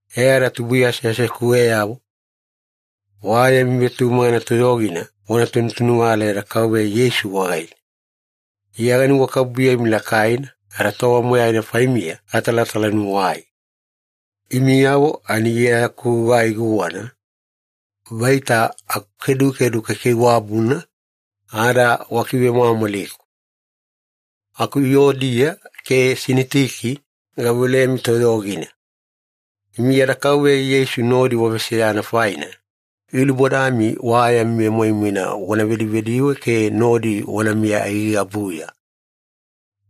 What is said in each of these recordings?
E ada tubuiya aseasekuweyavo, wa yami vetumagana toyogina wana tunutunuvala yada Kauveya Yeisu wagaine. Iya ganuwakabubuyemi lakaina ada tova moyaina faimiya gatalatalanuwai. Imiyavo ani Iya yaku gugai guwana, vaita akukedukedu kaikaiwabuna, ada wakivemwamwaliku. Aku Yuodiya ke Sinitiki, gaveolemi toyogina. Imi yada Kauveya Yeisu nodi waveseyana faina, gilubodami wa yami vemoimoina wana vedivediwe ke nodi wanamiya aigaigabuya.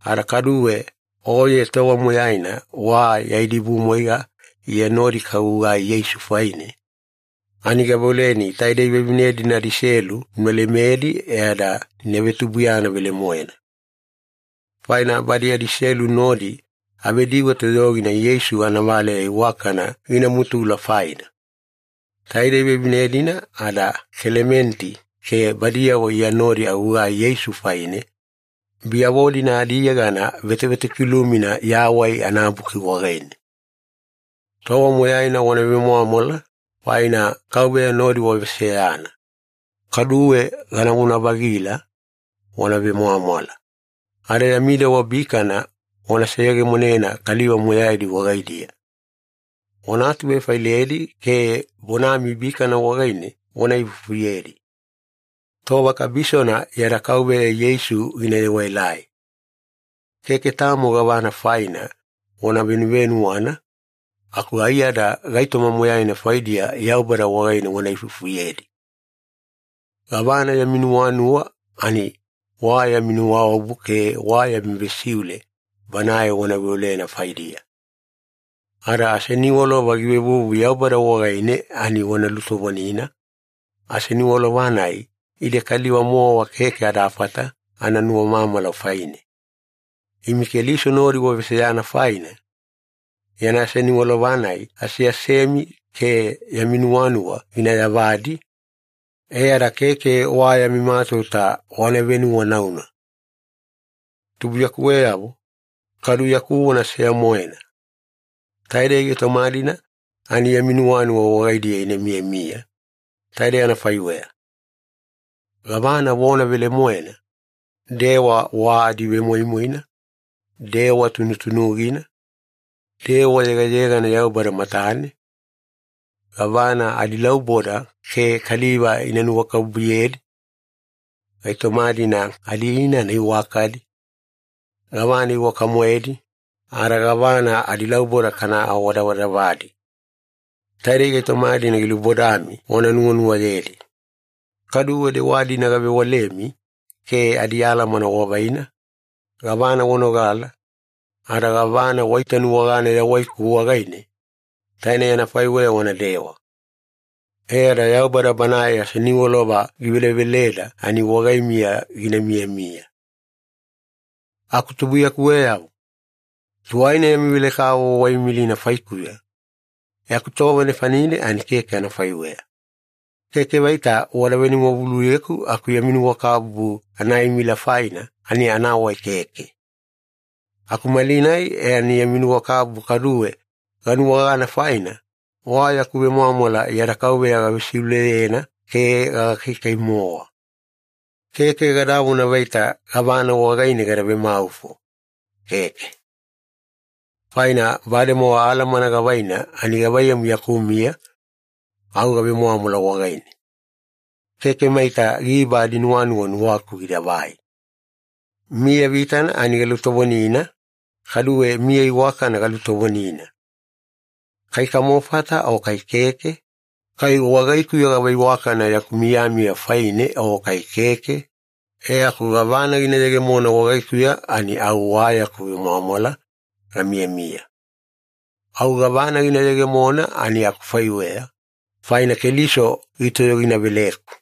Ada kaduwe oye tova moyaina wa ya idibumwaiga Iya nodi kagugai Yeisu faine, ani gaveoleni taidei vevine-dina adiselu una lemedi e ada ina vetubuiyana velemoena. Faina badi adiselu nodi avediwe toyogina Yeisu anavaleya iwakana gina mutula faina. Taidei vevine-dina ada Kelementi ke badiyavo Iya nodi agugai Yeisu faine, biyavo-dina adiyegana vetovetokilumina Yawai anaBuki wagaine. Tova moyaina wana vemwamwala, faina Kauveya nodi waveseyana. Kaduwe ganavona-vagila, wana vemwamwala. Ada yami dewa bikana wana seyegemonena kaliva moyaidi wagaidiya. Wana atuvefailedi ke bonami bikana wagaine wana ifufuyedi. Tova kabisona yada Kauveya Yeisu gina yewaelai. Keke tamo gavana faina wana venuwanauna, aku aiyada gaitoma moyaina faidiya Yaubada wagaine wana ifufuyedi. Gavana yami nuwanuwa ani wa yami nuwaobu ke wa yami vesiule Banae wana veolena faidiya. Ada aseniwalova givevuvu Yaubada wagaine ani wana lutovonina, aseniwalova-nai ide kaliva-mowa keke adafata ana nuwamamala faine. Imi Keliso nodi waveseyana faina, yana aseniwalova-nai aseasemi ke yami nuwanuwa gina yavadi, e ada keke wa yami matauta wana venuwanauna. Tubuiyakuweyavo, kadu yaku vona seya-moena. Taidei gaitoma-dina ani yami nuwanuwa wagaidiya ina miyamiya, taidei anafaiweya. Gavana vona velemoena, dewa wa adivemoimoina, dewa tunutunugina, dewa yegayegana Yaubada matane, gavana adilauboda ke kaliva ina nuwakabubuyedi, gaitoma-dina adiinana iwakadi, gavana iwaka-moedi, ada gavana adilauboda kana awadavadavadi. Taidei gaitoma-dina gilubodami wana nuwanuwayedi. Kaduwe dewa-dina gavewalemi ke adialamana wavaina, gavana wanogala, ada gavana waitanuwagana yawaiku wagaine, tainei anafaiweya wanadewa. E ada Yaubada Banae aseniwalova giveleveleda ani wagaimiya gina miyamiya. Aku tubuiyakuweyavo, tuwaina yami velekavovo waimilina faikuya, e aku tova nefanine ani keke anafaiweya. Keke vaita wada venuwavuluyeku aku yami nuwakabubu anaimila faina ani anawai keke. Aku malinai e ani yami nuwakabubu kaduwe ganuwagana faina, wa yaku vemwamwala yada Kauveya gavesiuleyena ke gagakaikai-mowa. Keke gadavona vaita gavana wagaine gada vemaufo, keke. Faina bademowa alamana gavaina ani gavaiyamu yaku miya, au gavemwamwala wagaine. Keke maita giba adinuwanuwa nuwaku gidavai. Miya vitana ani galutovonina, kaduwe miya iwakana galutovonina. Kai kamofata o kai keke, kai wagaikuya gava iwakana yaku miyamiya faine o kai keke, e aku gavana gina yegemona wagaikuya ani au wa yaku vemwamwala gamiyamiya. Au gavana gina yegemona ani akufaiweya, faina Keliso gitoyoginaveleku.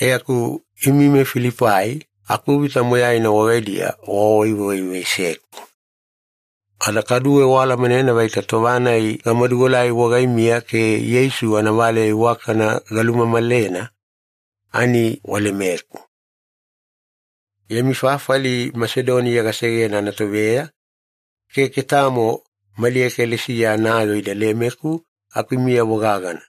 E aku imi meFilipai akuvita moyaina wagaidiya wawaiwaivaiseku. Ada kaduwe waalamanena vaita tova-nai gamaduelai wagaimiya ke Yeisu anavaleya iwakana galumamalena, ani walemeku. Yami fafali Masedoniya gasegena anatoveya, keke tamo mali ekalesiya anayoo ida lemeku aku imiyavo gagana.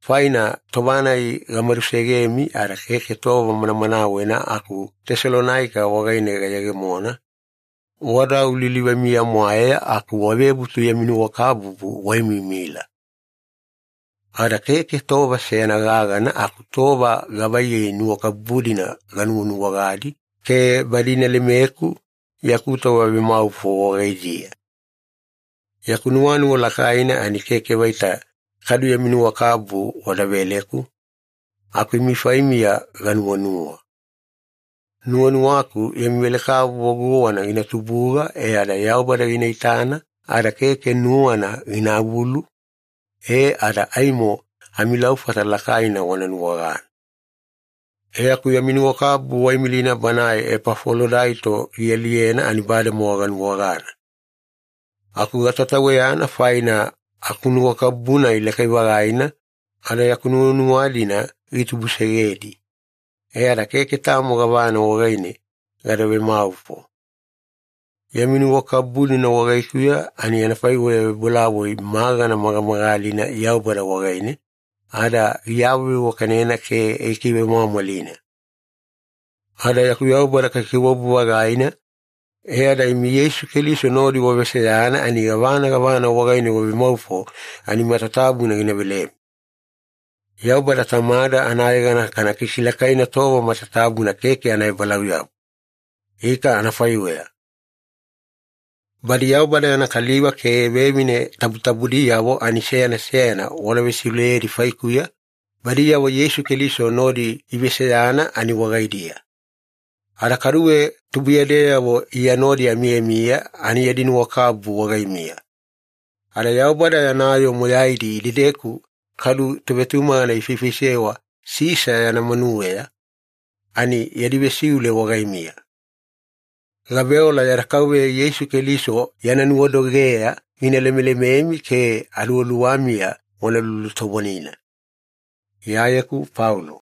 Faina tova-nai gamadusegemi ada keke tova manamanawena aku Tesalonaika wagaine gayegemona, wada au lilivamiya-mwaeya aku wavebutu yami nuwakabubu waimiimila. Ada keke tova seyana gagana aku tova gavaiyei nuwakabubu-dina ganuwanuwagadi ke badi ina lemeku yaku tova vemaufo wagaidiya. Yaku nuwanuwa lakaina ani keke vaita kadu yami nuwakabubu wada veleku, aku imi faimiya ganuwanuwa. Nuwanuwaku yami velekavovo guwana gina tubuga e ada Yaubada gina itana ada keke nuwana ginavulu, e ada aimo amilaufata lakaina wana nuwagana. E aku yami nuwakabubu waimilina banae Epafolodaito gialiyena ani bademowa ganuwagana. Aku gatataweyana faina akunuwakabubu-nai lakai-vagaina ada yaku nuwanuwa-dina gitubusegedi. E ada keke tamo gavana wagaine gada vemaufo. Yami nuwakabubu-dina wagaikuya ani anafaiweya vebolavoi magana magamagalina Yaubada wagaine, ada giawaveiwakanena ke gikivemwamwalina. Ada yaku Yaubada kaikaiwabu-vagaina, e ada imi Yeisu Keliso nodi waveseyana ani gavana gavana wagaine wavemaufo ani matatabuna gina velemi. Yaubada Tamada anayegana kana kikilakaina tova matatabuna keke anaebalauyabu. Ika anafaiweya. Badi Yaubada yana kaliva ke vevine tabutabudiyavo ani seyana seyana wana vesiuleyedi faikuya, badiyavo Yeisu Keliso nodi iveseyana ani wagaidiya. Ada kaduwe tubuiyadeyavo Iya nodi amiyamiya ani yadi nuwakabubu wagaimiya. Ada Yaubada yana yoo moyaidi idedeku kadu tovetumagana ifaifaisewa Sisa yana manuweya, ani yadi vesiule wagaimiya. Gaveola yada Kauveya Yeisu Keliso yana nuwadogeya gina lemelememi ke aluwaluwamiya wana lulutovonina. Iyayeku Paulo